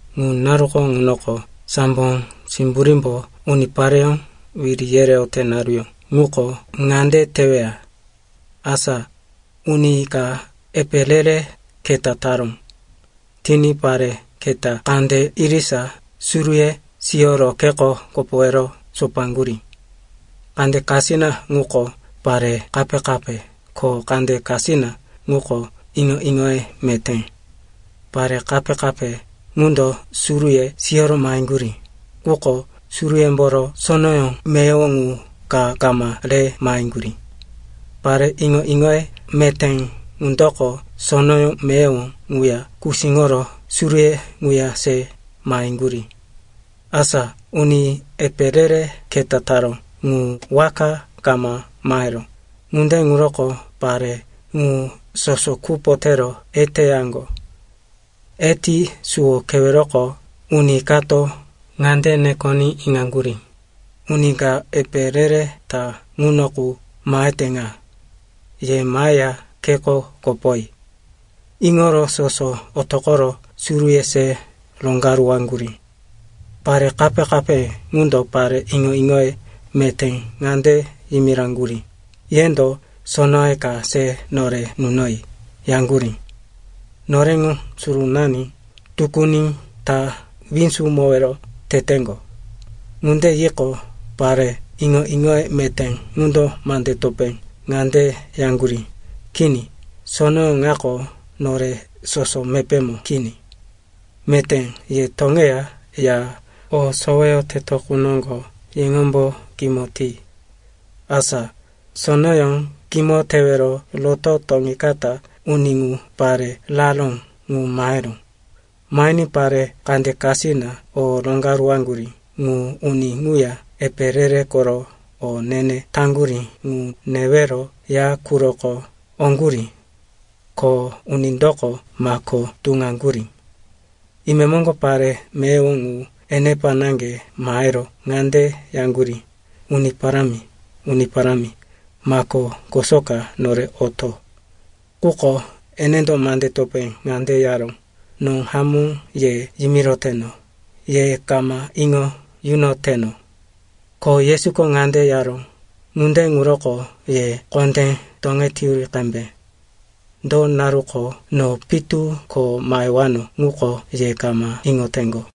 “Ŋu naruko ŋunoko sambo simburímbo unipareyó wiri yereyote naruyó ŋuko ŋande teweya. Asa uni ka epe re-re keta taró. Tiní pare keta kande irisa suruye siyoro kheko kopowero sopaŋgurí. Kande kasina ŋuko pare kape-kape ko kande kasina ŋuko iŋo-iŋoye meté. Pare kape-kape ŋundo suruye siyoro maheŋgurí, quko suruyemboro sonoyó meyowo ŋu ka kama re maheŋgurí. Pare iŋo-iŋoye meté ŋundoko sonoyó meyowo ŋuya kusíŋoro suruye ŋuya se maheŋgurí. “Asa uni epe re-re keta taró ŋu waka kama maheró, ŋunde ŋuroko pare ŋu soso kupo tero eteyaŋgo. Eti suwo keweroko uni kato ŋande nekoní iŋaŋgurí, ‘Uni ka epe re-re ta ŋuno qu mahete ŋa. Ye maheya kheko kopoyi.’ “Iŋoro soso otoqoro suruye se roŋgaruwaŋgurí. Pare kape-kape ŋundo pare iŋo-iŋoye meté ŋande yimiraŋgurí, ‘Yendo sonoye ka se nore nunoyi,’ yaŋgurí. ‘Noreŋo surunani tukuni ta winzumowero teteŋgo.’ “Ŋunde yiqo, pare iŋo-iŋoye meté ŋundo mande topé ŋande yaŋgurí, ‘Kini, sonoyó ŋako nore soso mepémo kini. Meté ye toŋeya ya o soweyoteto qu noŋgo yeŋombo kimo ti.’ “Asa sonoyó kimo tewero roto toŋikata uni ŋu pare raró ŋu maheró. Mahiní pare kande kasina o roŋgaruwaŋgurí ŋu uni ŋuya epe re-re koro o ne-ne taŋgurí ŋu newero ya quroko oŋgurí. Ko unindoko mako tuŋaŋgurí. “Imemoŋgo pare meyowo ŋu enepa naŋge mahero ŋande yaŋgurí, ‘Uni Parámi, Uni Parámi, mako kosoka nore oto.’ “Quko enendo mande topé ŋande yaró, ‘No hamó ye yimiroteno, ye kama iŋo yunoteno.’” Ko Yesuko ŋande yaró, “Ŋunde ŋuroko ye kondé toŋeteyuri qembe. Do naruko no pitu ko mahewano ŋuko ye kama iŋoteŋgo.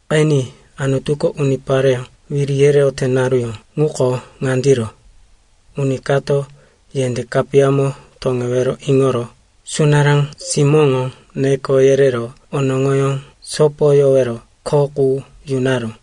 “Qeni, Anutuko unipareyó wiri yereyote naruyó ŋuko ŋandiro. Uni kato yendé kapiyamo toŋewero iŋoro sunará simóŋo neko yerero onoŋoyó sopoyowero kho qu yunaró.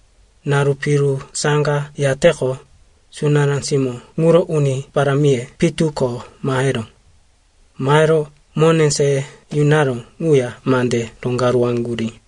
“Naru piru saŋga yateqo, sunará simó ŋuro uni parámiye pitu ko maheró. Mahero mone se yunaró ŋuya mande roŋgaruwaŋgurí.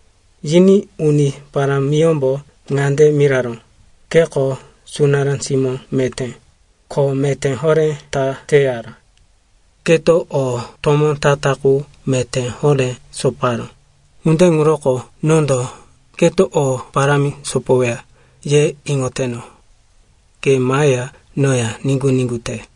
“Yiní uni parámiyómbo ŋande miraró, ‘Keko sunará simó meté, kho meté horé ta teyara. Keto o tomó ta-ta qu meté horé soparó, ŋunde ŋuroko nondo, keto o parámi sopoweya, ye iŋoteno. Ke maheya noya niŋgu-niŋgu te.’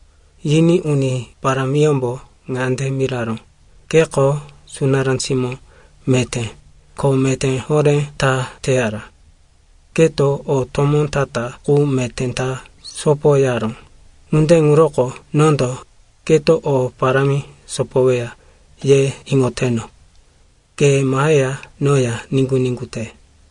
“Yiní uni parámiyómbo ŋande miraró, ‘Keko sunará simó meté, kho meté horé ta teyara. Keto o tomó ta-ta qu meté ta sopoyaró, ŋunde ŋuroko nondo, keto o parámi sopoweya, ye iŋoteno. Ke maheya noya niŋgu-niŋgu te.’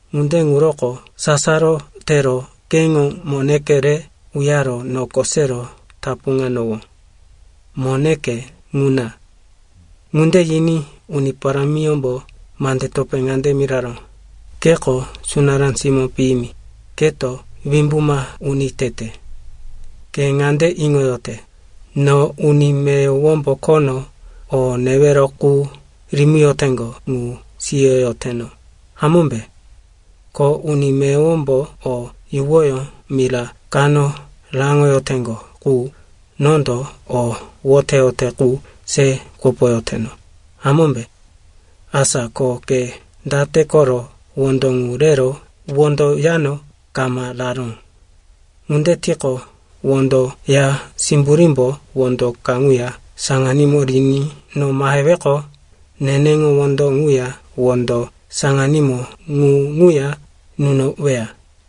Ŋunde ŋuroko sasaro tero keŋo moneke re uyaro noko sero tapuŋanowó. Moneke ŋuna.’ “Ŋunde yiní uni parámiyómbo mande topé ŋande miraró, ‘Keko sunará simó piyimi, keto wimbuma uni tete. Ke ŋande iŋoyote, no uni meyowombo khono o newero qu rimiyoteŋgo ŋu siyoyoteno, hamómbe? Ko uni meyowombo o yuwoyó mira kano raŋoyoteŋgo ŋu, nondo o woteyote ŋu se kopoyoteno, hamómbe? Asa ko ke date koro wondo ŋu rero wondo yano kama raró? Ŋunde tiqo, wondo ya simburímbo wondo kaŋuya saŋanímo riní no maheweqo, neneŋo wondo ŋuya wondo saŋanímo ŋu ŋuya nunoweya.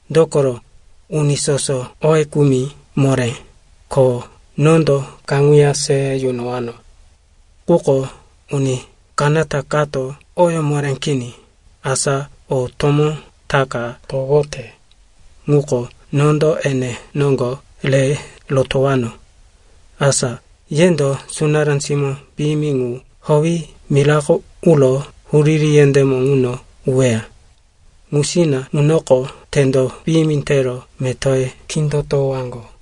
Dokoro, uni soso oye kumi moré, ko nondo kaŋuya se yunowano. Quko uni kanata kato oyó moré kini, asa o tomó ta ka towote, ŋuko nondo ene noŋgo re rotowano. Asa yendo sunará simó piyimi ŋu howi mirako uro huriri yendémo ŋuno uweya. Ŋusina ŋunoko tendo piyimi tero metoye kindotowaŋgo.’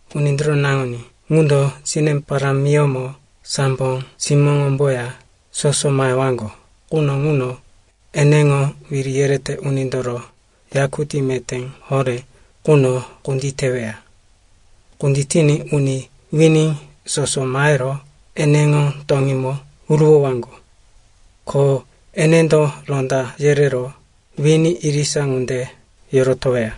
“Unindoro Naŋuní ŋundo sine parámiyómo sambo simóŋomboya soso mahewaŋgo quno ŋuno eneŋo wiri yerete unindoro yakutí meté horé ŋuno kunditeweya. Kunditiní uni wini soso mahero eneŋo toŋímo huruwowaŋgo. Ko enendo ronda yerero wini irisa ŋunde yorotoweya,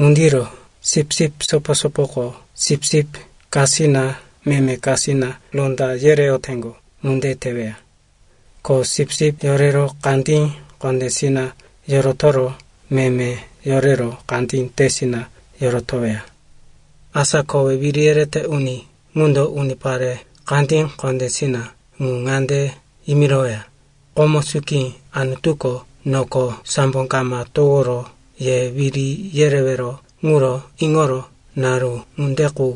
ŋundiro sipsip sopo-sopoko sipsip kasina meme kasina ronda yereyoteŋgo ŋunde teweya. Ko sipsip yorero kandí kondésina yorotoro meme yorero kandí tesina yorotoweya. “Asa kowe wiri yerete uni ŋundo unipare kandí kondésina ŋu ŋande yimiroweya, ‘Komo suki Anutuko noko sambo kama toworo ye wiri yerewero ŋuro iŋoro naru ŋunde qu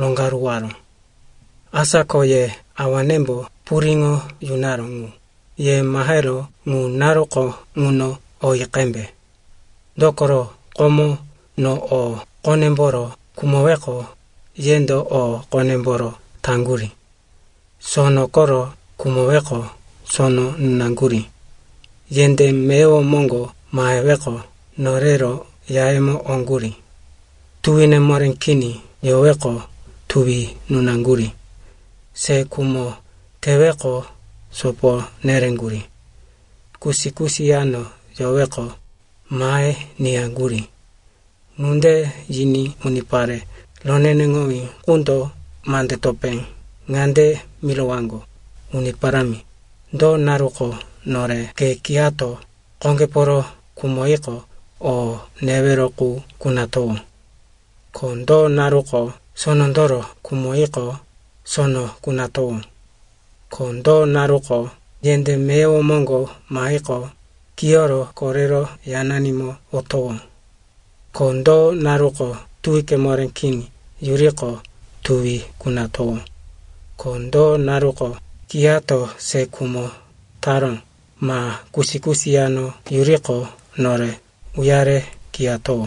roŋgaruwaró. Asa ko ye awanembo puriŋo yunaró ŋu, ye mahero ŋu naruko ŋuno oyi qembe. Dokoro, komo no o qonemboro khumoweqo, yendo o qonemboro taŋgurí. Sono koro khumoweqo, sono nunaŋgurí. Yendé meyowo moŋgo maheweqo, norero yayemo oŋgurí. Tuwine moré kini yoweqo, tuwi nunaŋgurí. Se khumo teweqo, sopo nereŋgurí. Kusi-kusi yano yoweqo, mahe niyaŋgurí.’ “Ŋunde yiní unipare roneneŋowí ŋundo mande topé ŋande mirowaŋgo, ‘Uni Parámi, do naruko nore ke kiyato qoŋgeporo khumoyiqo, o newero qu kunatowó? Ko do naruko sonondoro khumoyiqo, sono kunatowó? Ko do naruko yendé meyowo moŋgo mahiqo, kiyoro korero yananimo otowó? Ko do naruko tuwike moré kini yuriqo, tuwi kunatowó? Ko do naruko kiyato se khumo taró, ma kusi-kusi yano yuriqo, nore uyare kiyatowó?’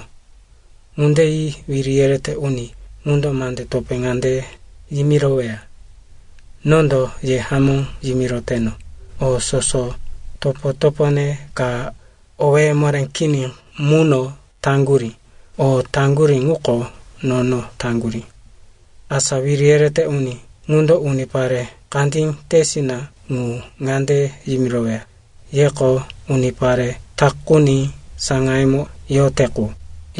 “Ŋunde yi wiri yerete uni ŋundo mande topé ŋande yimiroweya, ‘Nondo ye hamó yimiroteno, o soso topo-topone ka owéye moré kini muno taŋgurí, o taŋgurí ŋuko nono taŋgurí.’ “Asa wiri yerete uni ŋundo unipare kandí tesina ŋu ŋande yimiroweya, ‘Yeko unipare takuni saŋayemo yote qu,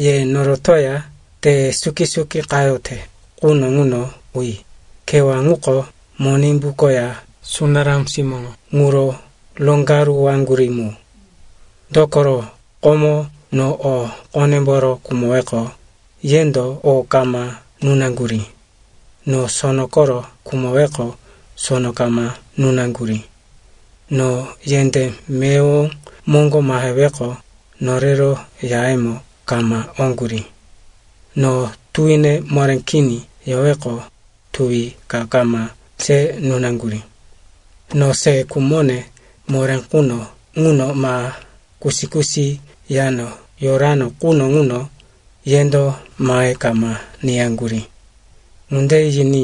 ye norotoya te suki-suki qayote quno ŋuno uyi, kewá ŋuko Monimbu koya sunará simóŋo ŋuro roŋgaruwaŋgurí mu. Dokoro komo no o qonemboro khumoweqo, yendo o kama nunaŋgurí. No sono koro khumoweqo, sono kama nunaŋgurí. No yendé meyowo moŋgo maheweqo, norero yayemo kama oŋgurí. No tuwine moré kini yoweqo, tuwi ka kama se nunaŋgurí. No se khumone moré quno ŋuno, ma kusi-kusi yano yorano quno ŋuno, yendo mahe kama niyaŋgurí.’ “Ŋunde yiní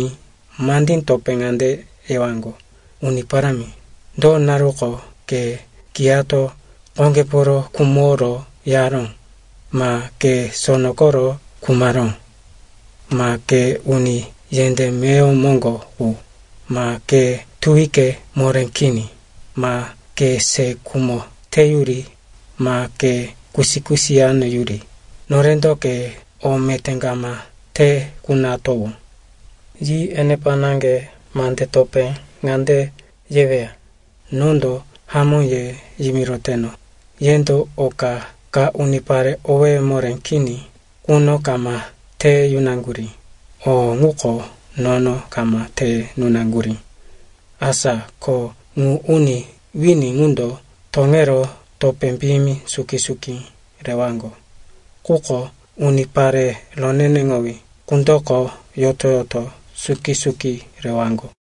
mandí topé ŋande yewaŋgo, ‘Uni Parámi, do naruko ke kiyato qoŋgeporo khumoro yaró, ma ke sono koro khumaró, ma ke uni yendé meyowo moŋgo qu, ma ke tuwike moré kini, ma ke se khumo teyuri, ma ke kusi-kusi yano yuri, norendo ke o meté kama te kunatowó?’ “Yi enepa naŋge mandeye topé ŋande yeweya, ‘Nondo hamó ye yimiroteno, yendo oka ka unipare owéye moré kini quno kama te yunaŋgurí, o ŋuko nono kama te nunaŋgurí.’ Asa ko ŋu uni wini ŋundo toŋero topé piyimi suki-suki rewaŋgo. Quko unipare roneneŋowí ŋundoko yoto-yoto suki-suki rewaŋgo.”